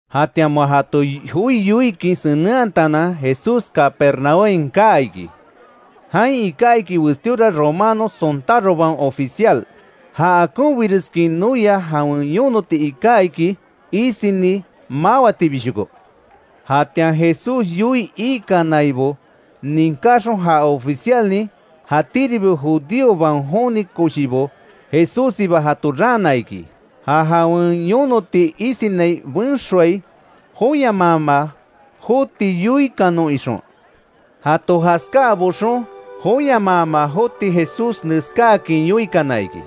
Jatian moa jato joi yoikin senenhatanan, Jesús Capernaúmhain kaa iki. Jain iká iki westíora romano sontárobaon oficial. Jan akonbireskin noia jawen yonoti iká iki, isini mawatibishoko. Jatian Jesús yoii ikanaibo ninkáxon, ja oficialnin, jatíribi judíobaon joni koshibo, Jesússiba jato raana iki; ja jawen yonoti isinai benxoai joyamaama joti yoikanon ixon. Jato jaskáa boxon, joyamaama joti Jesús neskáakin yoikana iki: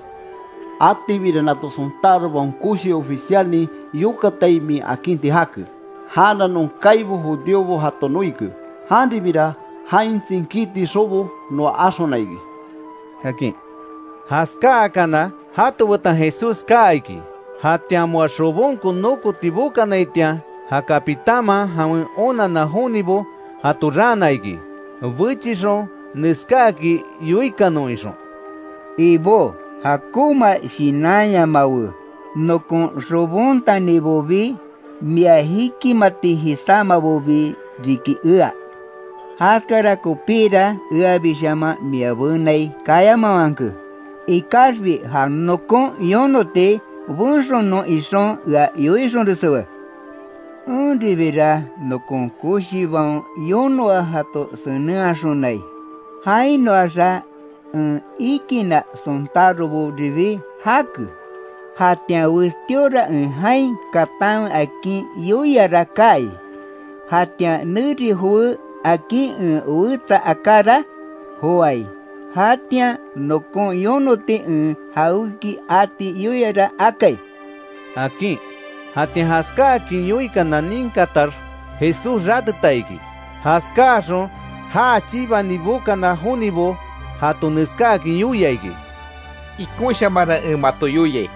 —Atibira nato sontárobaon koshi oficialnin yokatai min akinti jake. Janra non kaibo judíobo jato noike. Janribira, jain tsinkíti xobo noa axona iki —akin. Jaskáakana, jato betan Jesús kaa iki; jatian moa xobonko nokoti bokanaitian, ja capitánman, jawen onanna jonibo jato raana iki, bechixon neskáakin yoikanon ixon: “Ibó, jakonma shinanyamawe, nokon xobontanibobi, mia jikimati jisámabobi riki ea. Jaskara kopíra eabishaman mia benai kayamawanke. Ikaxbi ja nokon yonoti benxonon ixon, ea yoixonreswe. Enribira nokon koshibaon yonoa jato senenhaxonai. Jainoaxa, en ikinna sontároboribi jake; jatian westíora en jain katanwe akin yoiara kaai, jatian neri jowé akin en wetsa akára, joái; jatian nokon yonoti en jawéki ati yoiara akai”, akin. Jatian jaskáakin yoikana ninkatax, Jesús ráteta iki. Jaskáaxon, já chibani bokana jonibo, jato neskáakin yoia iki: —Ikonshamanra en mato yoiai: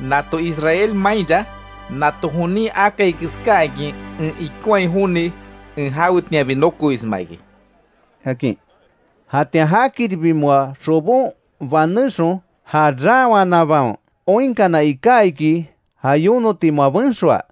Nato Israel mainra, nato jonin akai keskáakin ea ikonhai joni, en jawetianbi nokoisma iki —akin. Jatian jakiribi moa xobon banéxon, ja raanwanabaon oinkana iká iki, ja yonoti moa benxoa.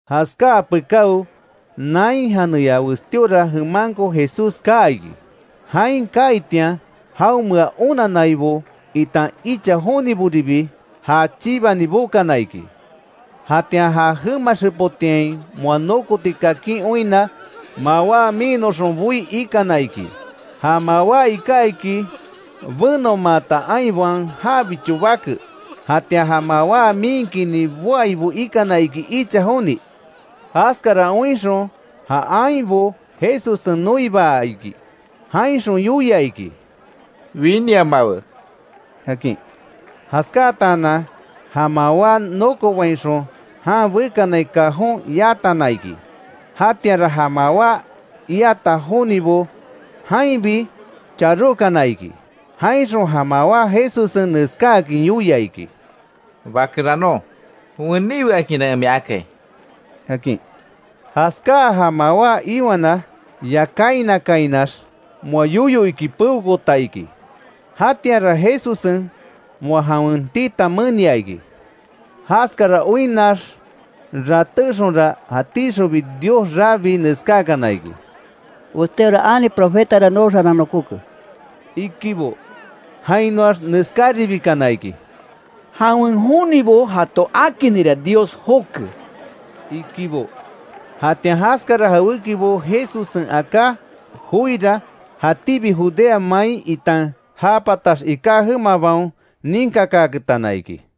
Jaskáa pekáo, Nain janeya westíora jemanko Jesús kaa iki. Jain kaaitian jaonmea onannaibo, itan icha joniboribi já chibani bokana iki. Jatian ja jema xepotiain moa nokoti kakin oinna, mawá miinnoxon boí ikana iki. Ja mawá iká iki, benomaata ainbaon jabicho bake, jatian ja mawá miinkini boaibo ikana iki icha joni. Jaskara oinxon, ja ainbo Jesussen noibaa iki; jainxon yoia iki: —Winiamawe —akin. Jaskáatanan ja mawá nokobainxon jan bekanai cajón yatana iki. Jatianra ja mawá iata jonibo jainbi charókana iki. Jainxon ja mawá Jesussen neskáakin yoia iki: —Bakeranon, weníwe akinra en mia akai —akin. Jaskáa, ja mawá iwana yakáinakainax moa yoyo iki peokoota iki; jatianra Jesussen moa jawen tita menia iki. Jaskara oinnax ratéxonra, jatíxonbi Dios rabii neskákana iki: —Westíora ani profetara nooxaran nokóke —ikibo. Jainoax neskáribikana iki: —Jawen jonibo jato akinira Dios joke —ikibo. Jatian jaskara jawékibo Jesussen aká joira, jatíbi Judea main itan ja patax iká jemabaon ninkakaaketana iki.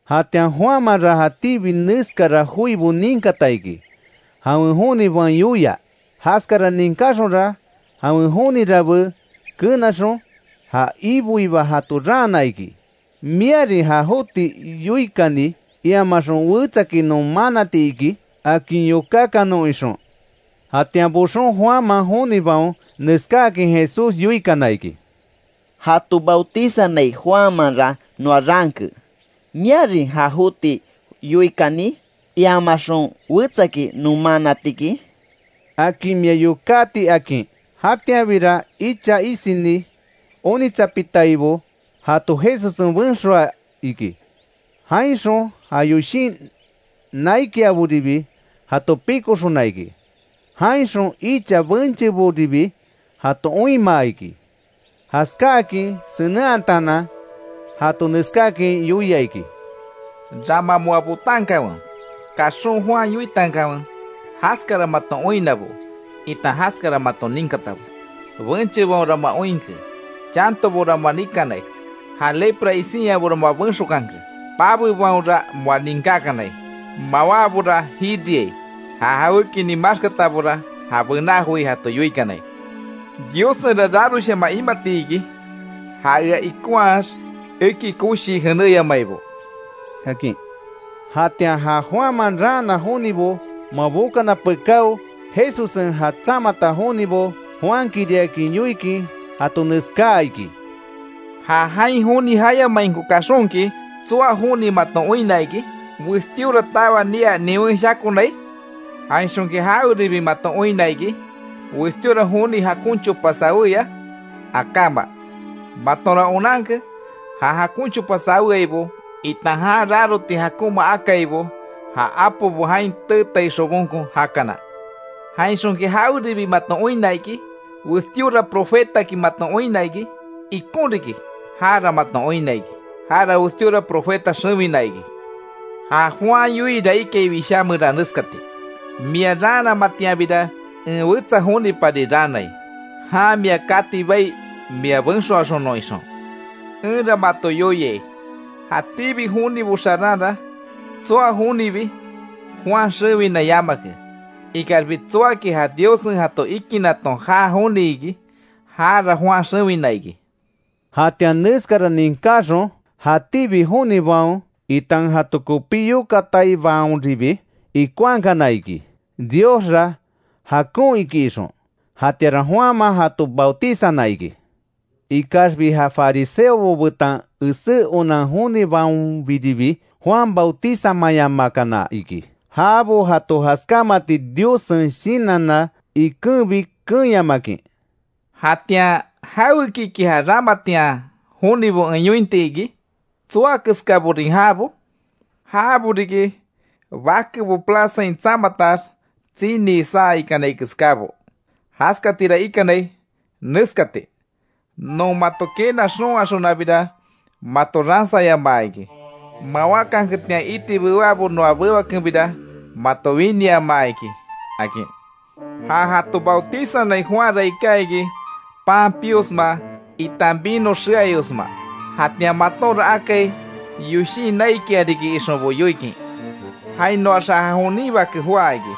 Jatian Juanmanra jatíbi neskara joibo ninkata iki, jawen jonibaon yoia; jaskara ninkáxonra, jawen joni rabe kenaxon, ja Iboiba jato raana iki ¿Miarin ja joti yoikani, iamaxon wetsaki non manati iki? akin yokákanon ixon. Jatian boxon, Juanman jonibaon neskáakin Jesús yoikana iki: —Jato bautizanai Juanmanra noa raanke, ¿Miarin ja joti yoikani, iamaxon wetsaki non manatiki? akin mia yokáti —akin. Jatianbira icha isini onitsapitaibo jato Jesussen benxoa iki, jainxon ja yoshin naikiaboribi jato pikoxona iki; jainxon icha bencheboribi jato oinmaa iki. Jaskáakin senenhataanan, jato neskáakin yoia iki: —Rama moa botankanwe, kaxon Juan yoitankanwe, jaskara maton oinnabo itan jaskara maton ninkatabo. Benchebaonra moa oinke; chantobora moa nikanai; ja lepra isinyabora moa benxokanke; pabebaonra moa ninkákanai; mawábora jiriai; ja jawékinin maxkatabora ja bená joi jato yoikanai. ¡Diossenra raroshaman imati iki, ja ea ikonhaax eki koshii jenéyamaibo! —akin. Jatian ja Juanman raana jonibo, moa bokana pekáo, Jesussen ja tsamata jonibo, Juankiriakin yoikin jato neskáa iki: “Ja jain joni jayamainko kaxonki ¿Tsoa joni maton oinna iki? ¿Westíora tawa nia niwen shakonai? Jainxonki jaweribi maton oinna iki ¿Westíora joni jakon chopa saweya? Akáma. Matonra onanke, ja jakon chopa saweaibo, itan jan raroti jakonma akaibo, ja apobo jain teetai xobonko jakana. ¿Jainxonki jaweribi maton oinna iki? ¿Westíora profetaki maton oinna iki? Ikon riki, jara maton oinna iki; jara westíora profeta xewina iki. Ja Juan yoiira ikai Wishá meran neskati: ‘Mia raanamatianbira, en wetsa jonipari raanai; jan mia kati bai, mia benxoaxonon’, ixon. Enra mato yoiai, jatíbi jonibo xaranra tsoa jonibi, Juan xewina yamake; ikaxbi tsoaki, ja Diossen jato ikinaton jaa joni iki, jara Juan xewina iki”. Jatian neskara ninkáxon, jatíbi jonibaon itan jato kopí yokataibaonribi ikonhakana iki, Diosra jakon iki ixon. Jatianra Juanman jato bautizana iki. Ikaxbi ja fariseobo betan esé onan jonibaonbiribi, Juan bautizamayamakana iki. Jabo jato jaskámati Diossen shinanna ikenbi keenyamakin. “Jatian ¿Jawekiki ja ramatian jonibo en yointi iki? ¿Tsoa keskaborin jabo? Jabo riki bakebo plazain tsamatax tsinii saa ikanai keskábo; jaskatira ikanai neskati: ‘Non mato quena xon axonabira, mato ransayamaa iki, mawákanketian iti bewábo noa bewakenbira mato winiamaa iki’, akin. Ja jato bautizanai Juanra iká iki pan piosma itan vino xeayosma; jatian matonra akai, yoshin naikia riki ixonbo yoikin. Jainoaxa ja jonin Bake joá iki;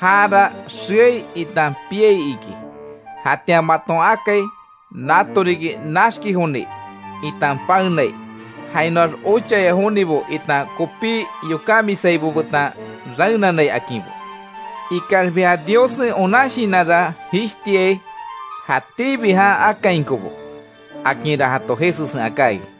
jara xeai itan piai iki. Jatian maton akai, nato riki naxki joni itan paenai, jainoax ochaya jonibo itan kopí yokámisaibo betan raenanai akinbo. Ikaxbi ja Diossen onan shinanra jishtiai, jatíbi jan akainkobo”, akinra jato Jesussen aká iki.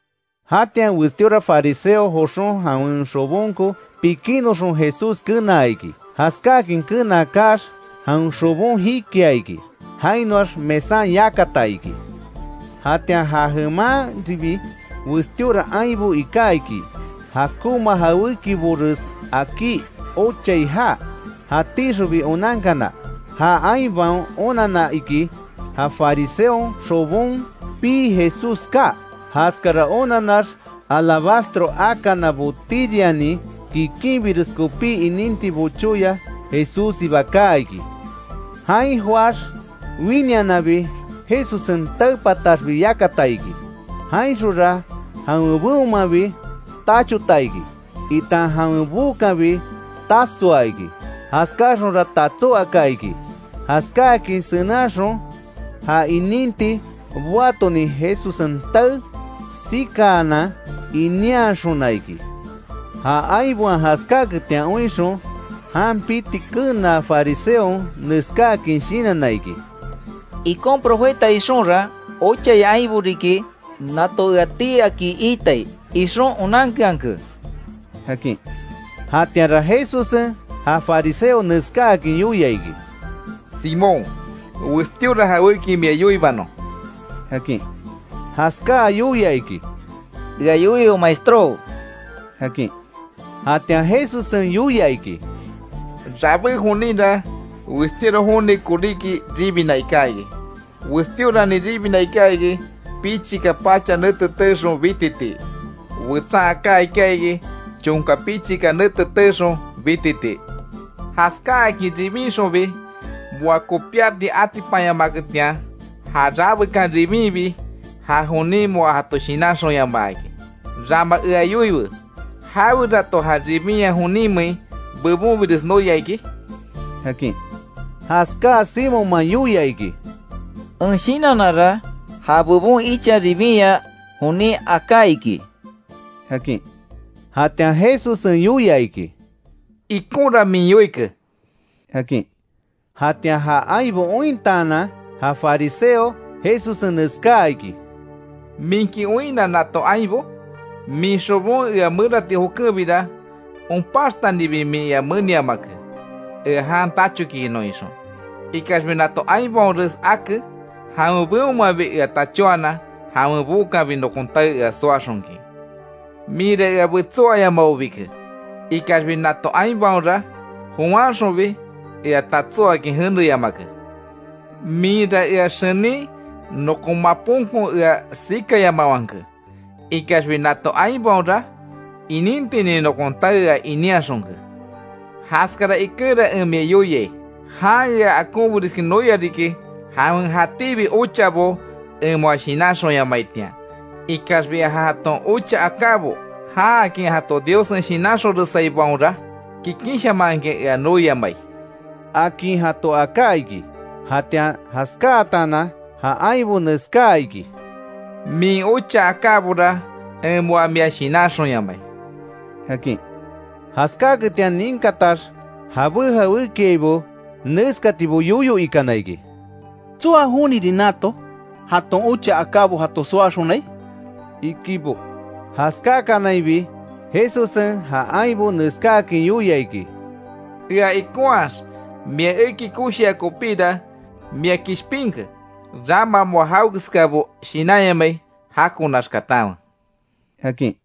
Jatian westíora fariseo joxon, jawen xobonko pikinnoxon Jesús kenaa iki. Jaskáakin kenaa kaax, jawen xobon jikia iki; jainoax mesan yakata iki. Jatian ja jemanribi westíora ainbo iká iki; jakonma jawékibores akí ochai jaa, jatíxonbi onankana. Ja ainbaon onanna iki, ja fariseon xobon pii Jesús kaa. Jaskara onanax, alabastro akana botírianin, kikinbires kopí ininti bochóya, Jesússiba kaa iki. Jain joáx, winiananbi Jesussen tae pataxbi yakata iki, jainxonra jawen beonmanbi, tachota iki, itan jawen bookanbi tasoa iki, jaskáaxonra tatsó aka iki. Jaskáakin senenhaxon, ja ininti boatonin, Jesussen tae sikaanan ininhaxona iki. Ja ainbaon jaskáaketian oinxon, jan piti kenaa fariseon, neskáakin shinanna iki: “Ikon profeta ixonra, ochaya ainbo riki nato ea tii aki iitai, ixon onankeanke”, akin. Jatianra Jesussen ja fariseo neskáakin yoia iki: —Simón, westíora jawéki mia yoibanon —akin. Jaskáa yoia iki: —Ea yoiwe maestró —akin. Jatian Jesussen yoia iki: —Rabé joninra, westíora joni koríki ribina iká iki; westíoranin ribina iká iki, pichika pacha nete teexon bititii; wetsan aká iká iki, chonka pichika nete teexon bititii. Jaskáakin ribinxonbi, moa kopíati atipanyamaketian, ja rabekan ribinbi ja jonin, moa jato shinanxonyamaa iki. Rama ea yoiwe ¿Jawerato ja ribinya joninmein bebonbires noia iki? —akin. Jaskáa Simonman yoia iki: —En shinannara, ja bebon icha ribinya jonin aká iki —akin. Jatian Jesussen yoia iki: —Ikonra min yoike —akin. Jatian ja ainbo ointaanan, ja fariseo Jesussen neskáa iki: —¿Minki oinna nato ainbo? Min xobon ea merati jokenbira, onpaxtanibi min ea meniamake; ea jan tachokiinon ixon. Ikaxbi nato ainbaonres ake, jawen beonmanbi ea tachóanan jawen bookanbi, nokon tae ea soaxonkin. Minra ea betsó ayamabobike; ikaxbi nato ainbaonra, jowanxonbi ea tatsó akin jeneyamake. Minra ea xenin nokon maponko ea sikayamawanke; ikaxbi nato ainbaonra inintinin nokon tae ea inínhaxonke. Jaskara ikenra en mia yoiai; jan ea akonbireskin noia riki, jawen jatíbi ochabo en moa shinanxonyamaitian. Ikaxbi ja jaton ocha akábo, jaakin jato Diossen shinanxonresaibaonra, kikinshamanhakin ea noiamai —akin jato aká iki. Jatian jaskáatanan ja ainbo neskáa iki: —Min ocha akábora en moa mia shinanxonyamai —akin. Jaskáaketian ninkatax jabé jawékiaibo, neskatibo yoyo ikana iki: —¿Tsoa jonirin nato, jaton ocha akábo jato soaxonai? —ikibo. Jaskákanainbi Jesussen ja ainbo neskáakin yoia iki: —Ea ikonhaax mia eki koshia kopíra, mia kishpinke, rama moa jawekeskabo shinanyamai jakonax katanwe —akin.